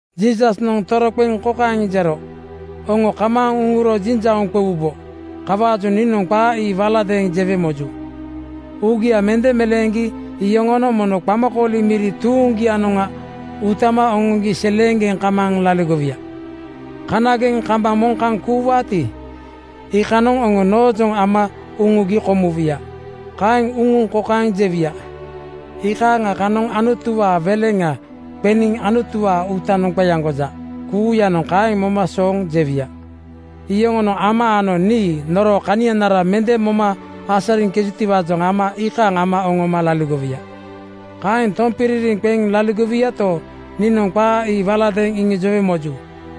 Jiisasnoŋ toroqeŋ kokaeŋ jero, “Oŋo kamaaŋ uŋuro jiŋjauŋ qewubo. Kawaajoŋ niinoŋ qaa ii waladeeŋ jewe moju. Uugia mende meleeŋgi iyoŋonoŋ mono qamakooli miri tuuŋgianoŋa utama oŋoŋgi seleeŋgeŋ kamaaŋ laligowuya. Kanageŋ kambaŋ moŋ kaŋ kuuwaati, iikanoŋ oŋo noojoŋa ama uŋugi komuwuya. Kaeŋ uŋuŋ kokaeŋ jewuya, ‘Iikaaŋa kanoŋ Anutuwaa weleŋa qeniŋ Anutuwaa uutanoŋ qeaŋgoja.’ Kuuyanoŋ kaeŋ moma sooŋ jewuya. Yoŋonoŋ Ama ano nii noroo kanianara mende moma asariŋkejutiwaajoŋ ama iikaaŋ ama oŋoma laligowuya. “Kaeŋ tompiririŋ qeŋ laligowuyato, niinoŋ qaa ii waladeeŋ iŋijowe moju.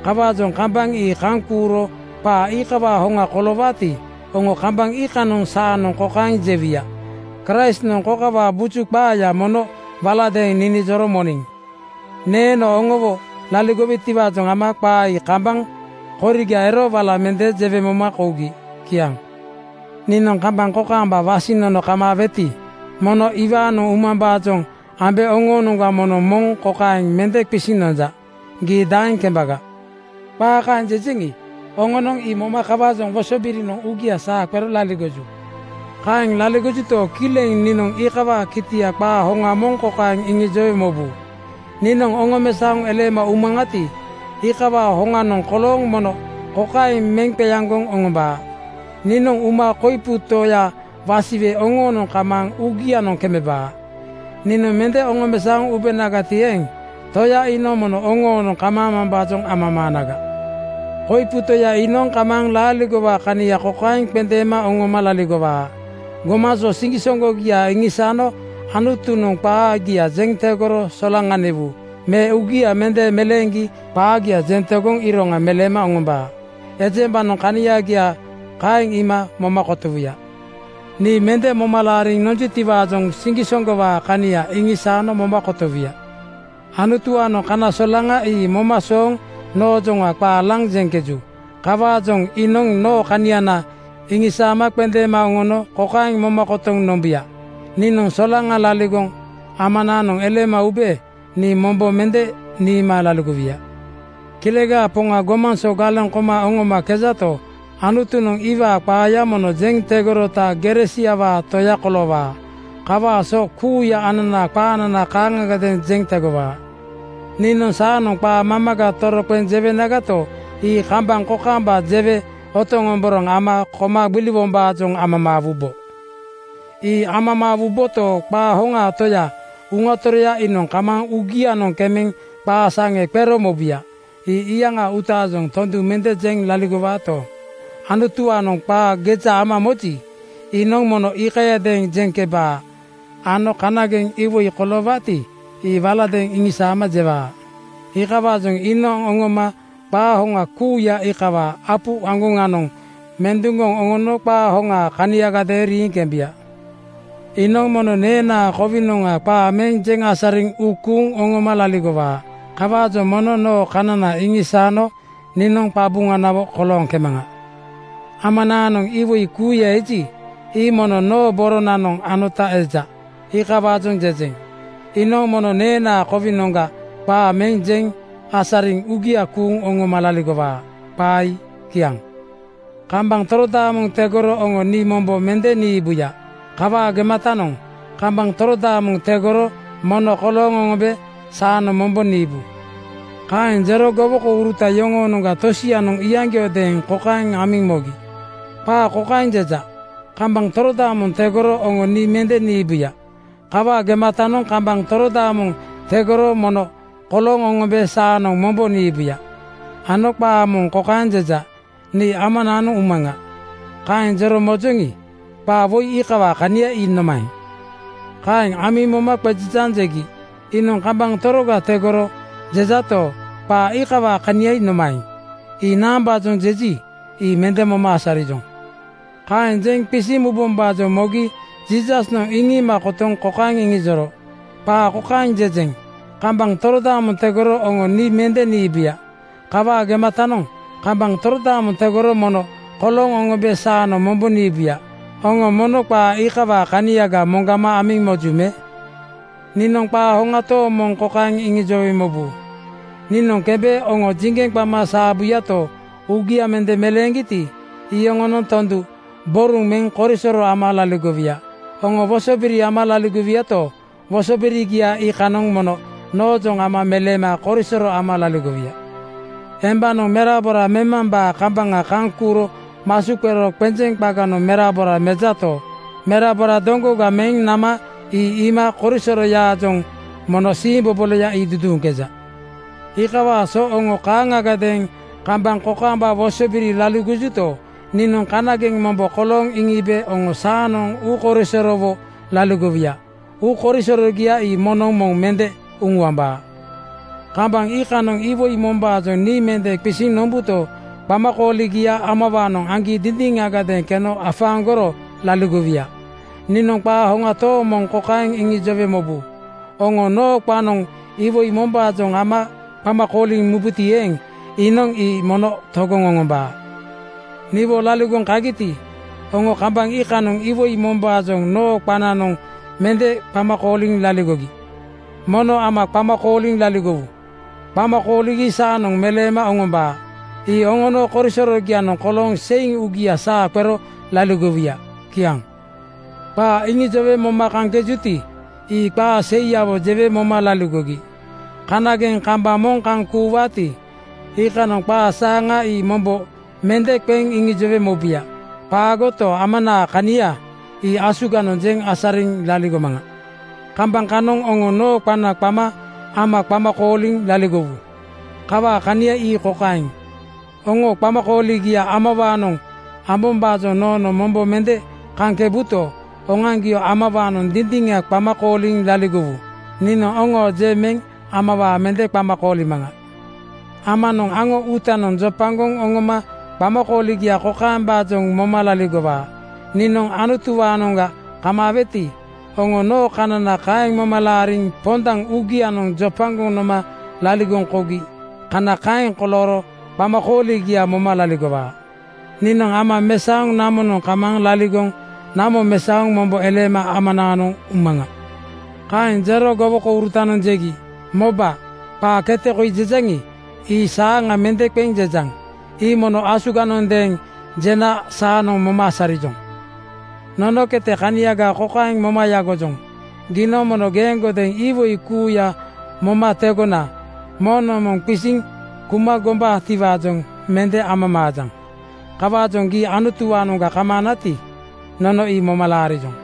Kawaajoŋ kambaŋ ii kaŋ kuuro qaa iikawaa hoŋa koloowaati, oŋo kambaŋ iikanoŋ saanoŋ kokaeŋ jewuya, ‘Kraistnoŋ kokawaa buju qaaya mono waladeeŋ ninijoro moniŋ.’ Neeno oŋowo laligowetiwaajoŋ ama qaa ii kambaŋ koriga ero wala mende jewe moma kougi.” Kiaŋ. “Niinoŋ kambaŋ kokaamba wasiŋ nono kamaaweti, mono iwaanoŋ umambaajoŋ ambe oŋoonoŋga moŋnoŋ moŋ kokaeŋ mende qisiŋ nonja, ‘Gii daeŋ kembaga?’ Qaa kaeŋ jejeŋi, oŋonoŋ ii moma kawaajoŋ wosobirinoŋ uugia saa qero laligoju. “Kaeŋ laligojuto, kileŋ niinoŋ iikawaa kitia qaa hoŋa moŋ kokaeŋ iŋijowe mobu: Niinoŋ oŋomesaoŋ eleema umaŋati, iikawaa hoŋanoŋ kolooŋ mono kokaeŋ meŋ qeaŋgoŋ oŋombaa: Niinoŋ uma koipu Toya wasiwe oŋoonoŋ kamaaŋ uugianoŋ kemebaa. Niinoŋ mende oŋomesaoŋ ubenagati eeŋ, Toya iinoŋ mono oŋoonoŋ kamaamambaajoŋ amamaanaga. “Koipu Toya iinoŋ kamaaŋ laaligowaa kania kokaeŋ qendeema oŋoma laligowaa: Gomaŋ so siŋgisoŋgogia iŋisaano Anutunoŋ qaagia jeŋ tegoro solaŋaniwu me uugia mende meleeŋgi qaagia jeŋ tegoŋ iroŋa meleema oŋombaa. Ejembanoŋ kaniagia kaeŋ iima moma kotowuya. Nii mende moma laariŋ nonjutiwaajoŋ siŋgisoŋgowaa kania iŋisaano moma kotowuya. “Anutuwaanoŋ kana solaŋa ii moma sooŋ noojoŋa qaa laŋ jeŋkeju. Kawaajoŋ iinoŋ noo kaniana iŋisaama qendeema oŋono kokaeŋ moma kotoŋ nombuya: Niinoŋ solaŋa laligoŋ Amanaanoŋ eleema ube nii mombo mende niima laligowuya. Kilegaa Poŋa gomaŋ so galeŋ koma oŋomakejato, Anutunoŋ iwaa qaaya mono jeŋ tegorota gere siawaa Toya koloowaa. Kawaa so kuuya ananaa qaanana kaaŋagadeeŋ jeŋ tegowaa. “Niinoŋ saanoŋ qaa mamaga toroqeŋ jewenagato, ii kambaŋ kokaamba jewe otoŋomboraŋ ama koma gbiliwombaajoŋ amamaawubo. Ii amamaawuboto, qaa hoŋaa Toya, Uŋa Toroya iinoŋ kamaaŋ uugianoŋ kemeŋ qaa saŋe qero mobuya. Ii iyaŋaa uutaajoŋ tondu mende jeŋ laligowaato, Anutuwaanoŋ qaa geja ama moji, iinoŋ mono iikayadeeŋ jeŋkebaa ano kanageŋ iwoi koloowaati, ii waladeeŋ iŋisaama jewaa. Iikawaajoŋ iinoŋ oŋoma qaa hoŋa kuuya iikawaa apu aŋgoŋanoŋ menduŋgoŋ oŋono qaa hoŋaa kaniagadeeŋ riiŋ kembu. “Iinoŋ mono neenaa kowinoŋa qaa meŋ jeŋ asariŋ uu kuuŋ oŋoma laligowaa. Kawaajoŋ mono noo kanana iŋisaano niinoŋ qabuŋanawo kolooŋkemaŋa. Amanaanoŋ iwoi kuuya eji, ii mono noo boronanoŋ anota eja. Iikawaajoŋ jejeŋ, ‘Iinoŋ mono neenaa kowinoŋga qaa meŋ jeŋ asariŋ uugia kuuŋ oŋoma laligowaa.’ Qaa ii kiaŋ.” “Kambaŋ torodaamoŋ tegoro oŋo nii mombo mende niibuya. Kawaa gematanoŋ kambaŋ torodaamoŋ tegorogo mono kolooŋ oŋombe saanoŋ mombo niibu.” Kaeŋ jero gowokouruta yoŋoonoŋga tosianoŋ iyaŋgiodeeŋ kokaeŋ amiŋ mogi, “Qaa kokaeŋ jeja, ‘Kambaŋ torodaamoŋ tegoro oŋo nii mende niibuya. Kawaa gematanoŋ kambaŋ torodaamoŋ tegorogo mono kolooŋ oŋombe saanoŋ mombo niibuya,’ ano qaa moŋ kokaeŋ jeja, ‘Nii Amanaanoŋ umaŋa.’ Kaeŋ jero mojoŋi, qaa woi iikawaa kania ii nomaeŋ?” Kaeŋ amiŋ moma qejejaaŋ jegi, “Iinoŋ ‘Kambaŋ toroga tegorogo,’ jejato, qaa iikawaa kania nomaeŋ? Ii naambaajoŋa jeji, ii mende moma asarijoŋ.” Kaeŋ jeŋ qisiŋ mubombaajoŋ mogi Jiisasnoŋ iŋiima kotoŋ kokaeŋ iŋijoro, “Qaa kokaeŋ jejeŋ, ‘Kambaŋ torodaamoŋ tegoro oŋo nii mende niibuya. Kawaa gematanoŋ kambaŋ torodaamoŋ tegorogo mono kolooŋ oŋombe saanoŋ mombo niibuya,’ Oŋo mono qaa iikawaa kaniaga moŋgama amiŋ moju me? “Niinoŋ qaa hoŋa tooŋ moŋ kokaeŋ iŋijowe mobu: Niinoŋ kembe oŋo jiŋgeŋ qama saabuyato, uugia mende meleeŋgiti, yoŋonoŋ tondu boruŋ meŋ korisoro ama laligowuya. Oŋo wosobiri ama laligowuyato, wosobirigia iikanoŋ mono noojoŋ ama meleema korisoro ama laligowuya. Embanoŋ merabora memambaa kambaŋa kaŋ kuuro masu qero qenjeŋ qaganoŋ merabora mejato, merabora doŋgoga meŋ nama ii iima korisoroyaajoŋ mono siimboboloya ii duduuŋkeja. Iikawaa so oŋo kaaŋagadeeŋ kambaŋ kokaamba wosobiriwo laligojuto, niinoŋ kanageŋ mombo kolooŋ iŋiibe oŋo saanoŋ uukoisorowo laligowuya. Uukoisorogia ii moŋnoŋ moŋ mende uŋuambaa. “Kambaŋ iikanoŋ iwoi mombaajoŋ nii mende qisiŋ nombuto, qamakooligia Amawaanoŋ aŋgi dindiŋagadeeŋ keno afaaŋgoro laligowuya. Niinoŋ qaa hoŋa tooŋ moŋ kokaeŋ iŋijowe mobu: Oŋo noo qanoŋ iwoi mombaajoŋ Ama qama kooliŋ mubuti eeŋ, iinoŋ ii mono togoŋ oŋombaa. Niwo laligoŋ kagiti, oŋo kambaŋ iikanoŋ iwoi mombaajoŋ noo qananoŋ mende qama kooliŋ laligogi. Mono Ama qama kooliŋ laligowu. Qama kooligi saanoŋ meleema oŋombaa. Ii oŋono korisorogianoŋ kolooŋ seiŋ uugia saa qero laligowuya.” Kiaŋ. “Qaa iŋijowe moma kaŋkejuti, ii qaa seiyawo jewe moma laligogi. Kanageŋ kambaŋ moŋ kaŋ kuuwaati, iikanoŋ qaa saaŋa ii mombo mende qeŋ iŋijowe mobuya. Qaagoto, Amanaa kania ii asuganoŋ jeŋ asariŋ laligomaŋa. Kambaŋ kanoŋ oŋo noo qana qama Ama qama kooliŋ laligowu. Kawaa kania ii kokaeŋ: Oŋo qamakooligia Amawaanoŋ ambombaajoŋ noonoŋ mombo mende kaŋkebuto, oŋoaŋgio Amawaanoŋ dindiŋa qama kooliŋ laligowu. Niinoŋ oŋoo je meŋ Amawaa mende qama koolimaŋa. “Amanoŋ aŋo uutanoŋ jopagoŋ oŋoma qamakooligia kokaembaajoŋa moma laligowaa: Niinoŋ Anutuwaanoŋga kamaaweti, oŋo noo kanana kaeŋ moma laariŋ pondaŋ uugianoŋ jopagoŋ noma laligoŋ kougi kana kaeŋ kolooro qamakooligia moma laligowaa. Niinoŋ Ama mesaoŋ namonoŋ kamaaŋ laligoŋ namo mesaoŋ mombo eleema Amanaanoŋ umaŋa.” Kaeŋ jero gowokourutanoŋ jegi, “Moba, qaa kete koi jejaŋi, ii saaŋa mende qeŋ jejaŋ. Ii mono asuganoŋgadeeŋ jena saanoŋ moma asarijoŋ. Nono kete kaniaga kokaeŋ moma yagojoŋ: Giinoŋ mono geeŋgodeeŋ iwoi kuuya moma tegona moŋnoŋ moŋ qisiŋ kuma gombaatiwaajoŋ mende amamaajaŋ. Kawaajoŋ gii Anutuwaanoŋga kamaanati, nono ii moma laarijoŋ.”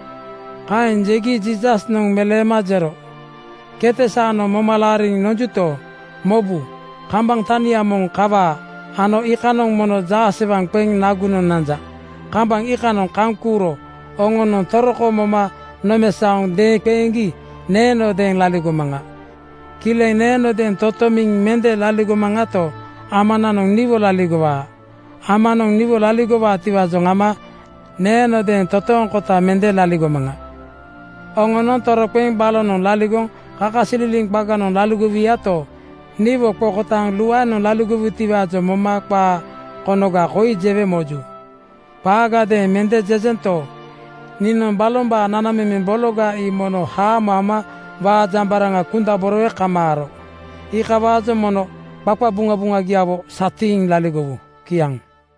Kaeŋ jegi Jiisasnoŋ meleema jero, “Kete saanoŋ moma laariŋ nonjuto, mobu, kambaŋ tania moŋ kawaa ano iikanoŋ mono jaasewaŋ qeŋ nagunoŋ nanja. Kambaŋ iikanoŋ kaŋ kuuro oŋonoŋ toroko moma nomesaoŋ deeŋqeeŋgi neenodeeŋ laligomaŋa. Kileŋ neenodeeŋ totomiŋ mende laligomaŋato, Amananoŋ niwo laligowaa. Amanoŋ niwo laligowaatiwaajoŋ ama neenodeeŋ totooŋkota mende laligomaŋa. Oŋonoŋ toroqeŋ balonoŋ laligoŋ kakasililiŋ qaganoŋ laligowuyato, niwo qokotaaŋ luaenoŋ laligowutiwaajoŋ moma qaa konoga koi jewe moju. Qaagadeeŋ mende jejento, niinoŋ balombaa nanamemeŋ bologa ii mono haamo ama waajambaraŋa kundaborowe kamaaro. Iikawaajoŋ mono qaqabuŋabuŋagiawo satiiŋ laligowu.” Kiaŋ.